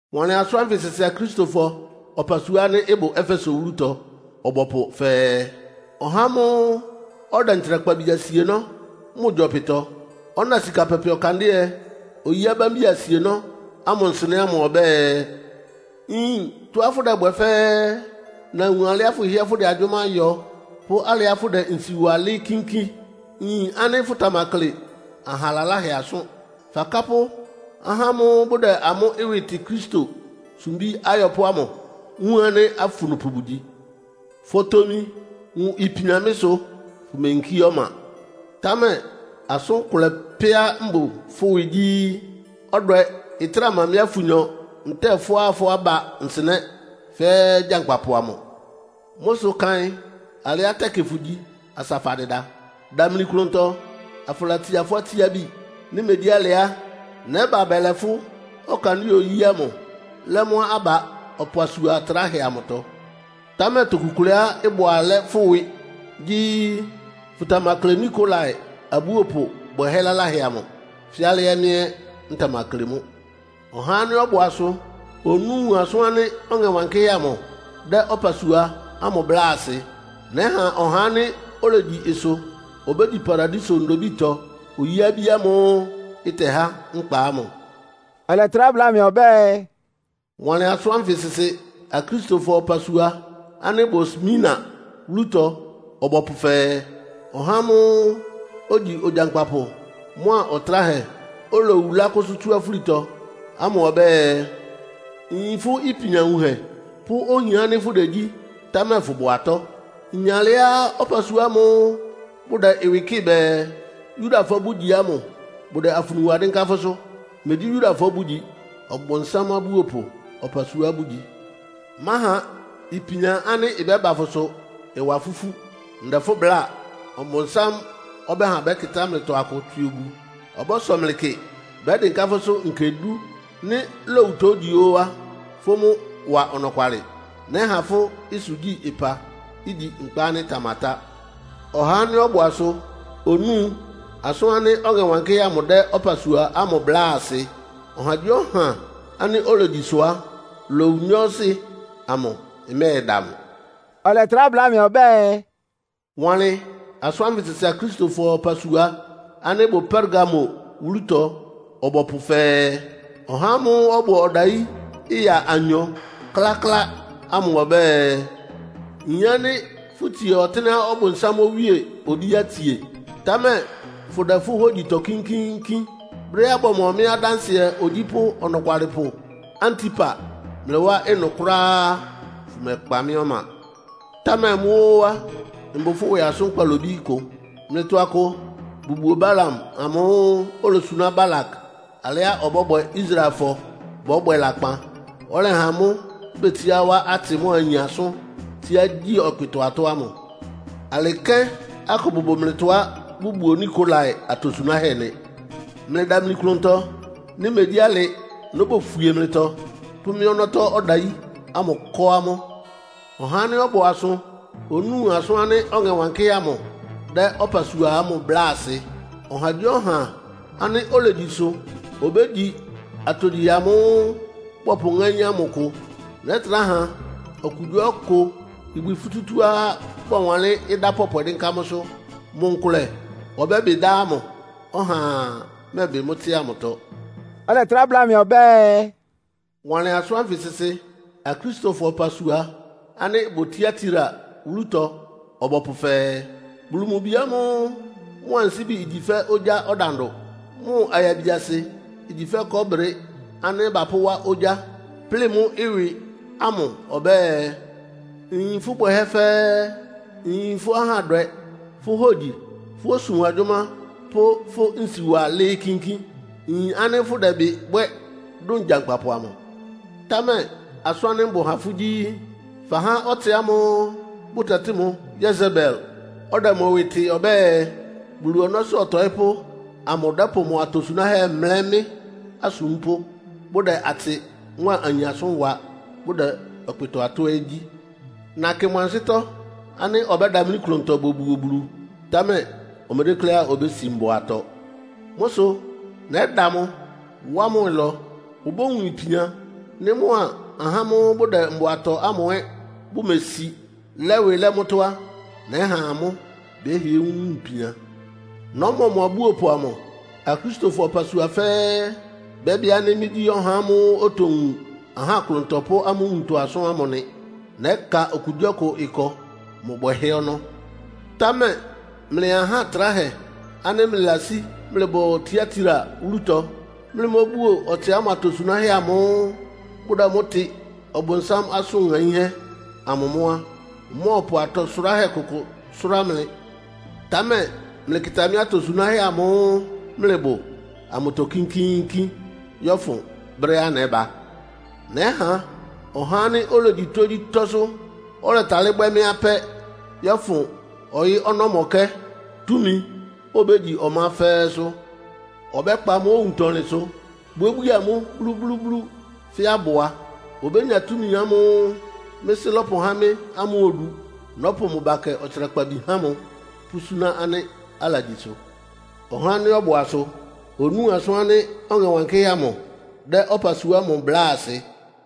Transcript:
“Wanlɩn asʋ́n ánfɩ sɩsɩ Akristofɔ ɔpasua ánɩ́ ɩbʋ Efeso wúlutɔ ɔbɔpʋ fɛɛ, “Ɔhá ámʋ́ʋ́ ɔdɛ ntsrakpabi asienɔ́ mʋ gyɔpɩtɔ, ɔna sika pɛpɛ ɔkandɩ́ɛ-oyí abámbi asienɔ́ ámʋ nsɩnɛ́ ámʋ ɔbɛ́ɛ: Nyin tɔ́á fʋdɛbwɛ fɛ́ɛ́. Nawun alɩá fʋhɩ́ɛ́ fʋdɛ agyʋ́má yɔ, pʋ́ alɩá fʋdɛ nsi wa lɩ́ɩ́ kínkín. Nyin ánɩ́ fʋtamakle aha laláhɛ asʋ́n. Fakápʋ́ ahá ámʋ́ʋ́ bʋdɛ amʋ́ ɩwɩ tɩ Kristo sumbí ayɔpʋ́ ámʋ, wun ánɩ́ afunupʋ bʋgyi. Fotomi wun ipian mɩ́ sʋ, fʋ́meyinkí ɔma. Támɛ asʋ́n kʋlɛ pɛ́á mbʋ fʋ́ ɩwɩ gyí, ɔdwɛ ɩtráa ma mɩ́a fʋnyɔ ntɛ́ɛ fʋ́a fʋ́ aba nsɩnɛ́ fɛ́ gyankpapʋ amʋ. Mʋ́ sʋ kaɩn alɩá tɛkɩ fʋgyi asa fadɩda. Damli klʋntɔ, afʋlatsia fʋ́ atsiábi. Nɩ́ megyí alɩ á, nɛ́ba bɛlɛ fʋ́ ɔkandɩ́ɛ-oyí ámʋ lɛ́ mʋ́ aba ɔpasua atráhɛ amʋtɔ. Támɛ toku kʋlɛá ɩbʋ alɛ́ fʋ́ ɩwɩ gyí, fʋtamakle Nikolai abúopʋ bwɛhɛ́ laláhɛ amʋ, fɛ́ alɩá mɩ́ ɛ́ ntamakle mʋ́. “Ɔhá ánɩ́ ɔbʋ asʋ onúu asʋn ánɩ́ Ɔŋɛ Wankɩ́hɛ́ amʋ dɛ́ ɔpasua ámʋ bláa asɩ. Nɛ́ha ɔhá ánɩ́ olegyi ɩsʋ obégyi Paradiso ndobítɔ oyí-abí ámʋ́ʋ́ ɩtɛhá nkpa ámʋ.” Ɔlɛtrá bláa mɩ ɔbɛ́ɛ, “Wanlɩn asʋ́n ánfɩ sɩsɩ Akristofɔ ɔpasua ánɩ́ ɩbʋ Smirna wúlutɔ ɔbɔpʋ fɛɛ, “Ɔhá ámʋ́ʋ́ ogyi Ogyankpapʋ mʋ́a Ɔtráhɛ, olowu lákʋ́sʋ́ tsú afúlitɔ ámʋ ɔbɛ́ɛ: Nyin fʋ́ ipian wunhɛ pʋ́ ohian ánɩ́ fʋdegyí, támɛ fʋbʋ atɔ́! Nyin alɩá ɔpasua ámʋ́ʋ́ bʋdɛ ɩwɩ kɩ́ɩ bɛɛ, Yudafɔ bʋ́gyi ámʋ bʋdɛ afunu wa dɩ́nká fʋ́sʋ́. Megyí Yudafɔ bʋ́gyi, Ɔbʋnsám abúopʋ ɔpasua bʋgyi. Máha ipian ánɩ́ ɩbɛ́ba fʋsʋ ɩwa fʋ́ ifú. Ndɛ fʋ́ bláa, Ɔbʋnsám ɔbɛ́ha bɛ́kɩtá mlɩtɔ akʋ tswɩ obu. Ɔbɔ́sɔ mlɩ kɩ. Bɛ́dɩnká fʋ́sʋ́ nkɛ dú. Nɩ́ lowutɔ ígyi ó á, fʋ́ mʋ́ wa ɔnɔkwalɩ. Nɛ́ha fʋ́ ɩsʋgyi-ɩpa, igyi nkpa ánɩ́ ɩtamatá. “Ɔhá ánɩ́ ɔbʋ asʋ onúu asʋn ánɩ́ Ɔŋɛ Wankɩ́hɛ́ amʋ dɛ́ ɔpasua ámʋ bláa asɩ. Ɔhagyíɔha ánɩ́ olegyi ɩsʋ á, lowu nyɔɔsɩ amʋ ɩmɛ́ɛda mʋ.” Ɔlɛtrá bláa mɩ ɔbɛ́ɛ, “Wanlɩn asʋ́n ánfɩ sɩsɩ Akristofɔ ɔpasua ánɩ́ ɩbʋ Pergamo wúlutɔ ɔbɔpʋ fɛɛ, “Ɔhá ámʋ́ʋ́ ɔbʋ ɔdayí ɩya anyɔ kláklá ámʋ ɔbɛ́ɛ: Nyin ánɩ́ fʋtsie ɔtɩ́nɛ́á Ɔbʋnsám owíe obíá itsie, támɛ fʋdɛ fʋ́ hógyitɔ kínkíínkín. Brɛ́á bɔmɔ mɩ́ adánsɩɛ ogyípʋ́ ɔnɔkwalɩpʋ Antipa mlɩ wá ɩnʋ kʋ́ráá á, fʋmɛkpa mɩ́ ɔma. Támɛ mʋ́ ó á, mbʋ fʋ́ ɩwɩ asʋ́n kpalobí kʋ. Mlɩtɔ akʋ bʋbuo Balaam amʋ́ʋ́ olosuná Balak alɩá ɔbɔ́bwɛ Israelfɔ bɔ́bwɛ lakpan, ɔlɛha amʋ́ betsiá wá atsɩ mʋ́a ayin asʋ́n, tsíá gyi ɔkpɩtɔ-atɔ́ ámʋ. Alɩ kɛ́n akʋ bʋbʋ mlɩtɔá bʋbuo Nikolai atosunáhɛ́ nɩ. Mlɩdamli klʋntɔ. Nɩ́ megyí alɩ nóbofwie mlɩtɔ, pʋ́ mɩ́ ɔnɔ́tɔ́ ɔdayí ámʋ kɔ́ amʋ́. “Ɔhá ánɩ́ ɔbʋ asʋ onúu asʋ́n ánɩ́ Ɔŋɛ Wankɩ́hɛ́ amʋ dɛ́ ɔpasua ámʋ bláa asɩ. “Ɔhagyíɔha ánɩ́ olegyi ɩsʋ obégyi atogyihɛ amʋ́ʋ́ bɔpʋŋáín ámʋ kʋ. Nɛ́trá ha okugyíɔkʋ ibwi futútúá bɔwanlɩ́n ɩdá pɔpwɛ dɩ́nká mʋ́sʋ́. Mʋ nkʋlɛ ɔbɛ́bɩ dá ámʋ. Ɔhaa mɛ́ɛbɩ mʋ́ tsɩ́a mʋtɔ.” Ɔlɛtrá bláa mɩ ɔbɛ́ɛ, “Wanlɩn asʋ́n ánfɩ sɩsɩ Akristofɔ ɔpasua ánɩ́ ɩbʋ Tiatira wúlutɔ ɔbɔpʋ fɛɛ, “Bulu mʋ Bi ámʋ́ʋ́ mʋ ansíbi igyi fɛ́ ogyá ɔdandʋ, mʋ ayabiasɩ igyi fɛ́ kɔɔ́brɩ ánɩ́ bapʋ́wá ogyá, plɩ́ɩ mʋ́ ɩwɩ ámʋ ɔbɛ́ɛ: Nyin fʋ́ bwɛhɛ́ fɛ́ɛ́. Nyin fʋ́ ahádwɛ, fʋ́ hógyi, fʋ́ osum agyʋ́má pʋ́ fʋ́ nsiwa lɩ́ɩ́ kínkín. Nyin ánɩ́ fʋdɛbɩ bwɛ́ dʋn gyankpapʋ amʋ. Támɛ asʋ́n ánɩ́ mbʋ ha fʋ́ gyí, fahá ɔtsɩ ámʋ́ʋ́ bʋtɛtɩ́ mʋ Yesebel, ɔdɛ mʋ ɩwɩ tɩ ɔbɛ́ɛ, Bulu ɔnɔ́sʋ́ ɔtɔɩ́pʋ́ amʋ dɛ́pʋ mʋ atosunáhɛ́ mlɛ́ mɩ́ asúmpʋ́, bʋdɛ atsɩ mʋ́a ayin asʋ́n wa, bʋdɛ ɔkpɩtɔ-atɔ́ ɛ́ gyí. Nakɩ mʋ ansɩ́tɔ́ ánɩ́ ɔbɛ́damlí klʋntɔ bobuo Bulu, támɛ omedékléá obési mbʋatɔ. Mʋ́ sʋ nɛ́da mʋ, wá mʋ ɩlɔ. Obówun ipian. Nɩ́ mʋa ahá ámʋ́ʋ́ bʋdɛ mbʋa tɔ ámʋ ɛ́ bʋmesi, lɛ́ ɩwɩ lɛ́ mʋ́tɔ́ á, nɛ́ha amʋ́ bɛ́hɩɛ wun ipian. Nɔ́mɔ mʋ abúopʋ amʋ. Akristofɔ ɔpasua fɛ́ɛ́ bɛ́bɩ ánɩ́ mɩ́gyí ɔhá ámʋ́ʋ́ otowun ahá klʋntɔ pʋ́ amʋ́ nwuntɔ asʋ́n ámʋ nɩ. Nɛ́ka okugyíɔkʋ ɩkɔ mʋ bwɛhɛ́ ɔnɔ́. “Támɛ mlɩ aha tráhɛ ánɩ́ mlɩlasí mlɩbʋ Tiatira wúlutɔ, mlɩmóbuo ɔtsɩ ámʋ atosunáhɛ́ amʋ́ʋ́ bʋdɛ mʋ́ tɩ ‘Ɔbʋnsám asʋn ŋaínhɛ́’ amʋ mʋ́ á, mmɔ́ɔpʋ atɔ sʋráhɛ́ kʋkʋ sʋ́rá mlɩ. Támɛ mlɩkɩta mɩ́ atosunáhɛ́ amʋ́ʋ́ mlɩbʋ amʋtɔ kínkíínkín yɔ́fʋn brɛ́á nɛ́ba. Nɛ́ha ɔhá ánɩ́ olegyi tógyítɔ́sʋ́, ɔlɛtalɩ́ bwɛ́ mɩ́ apɛ́ yɔ́fʋn ɔyɩ́ ɔnɔ́mɔkɛ́ túmi, obégyi ɔmá fɛ́ɛ́sʋ́. Ɔbɛ́kpa amʋ́ owuntɔlɩnsʋ, bwíébwíe amʋ́ blúblúblú fɛ́ abʋa. Obénya túmi ámʋ́ʋ́ mɩ́ Sɩ́ lɔ́pʋhá mɩ́ ámʋ odu. Nɔ́pʋ mʋ bakɛ ɔtsrakpabi há mʋ, pʋ́súná ánɩ́ alagyi ɩsʋ. “Ɔhá ánɩ́ ɔbʋ asʋ onúu asʋ́n ánɩ́ Ɔŋɛ Wankɩ́hɛ́ amʋ dɛ́ ɔpasua ámʋ bláa asɩ.”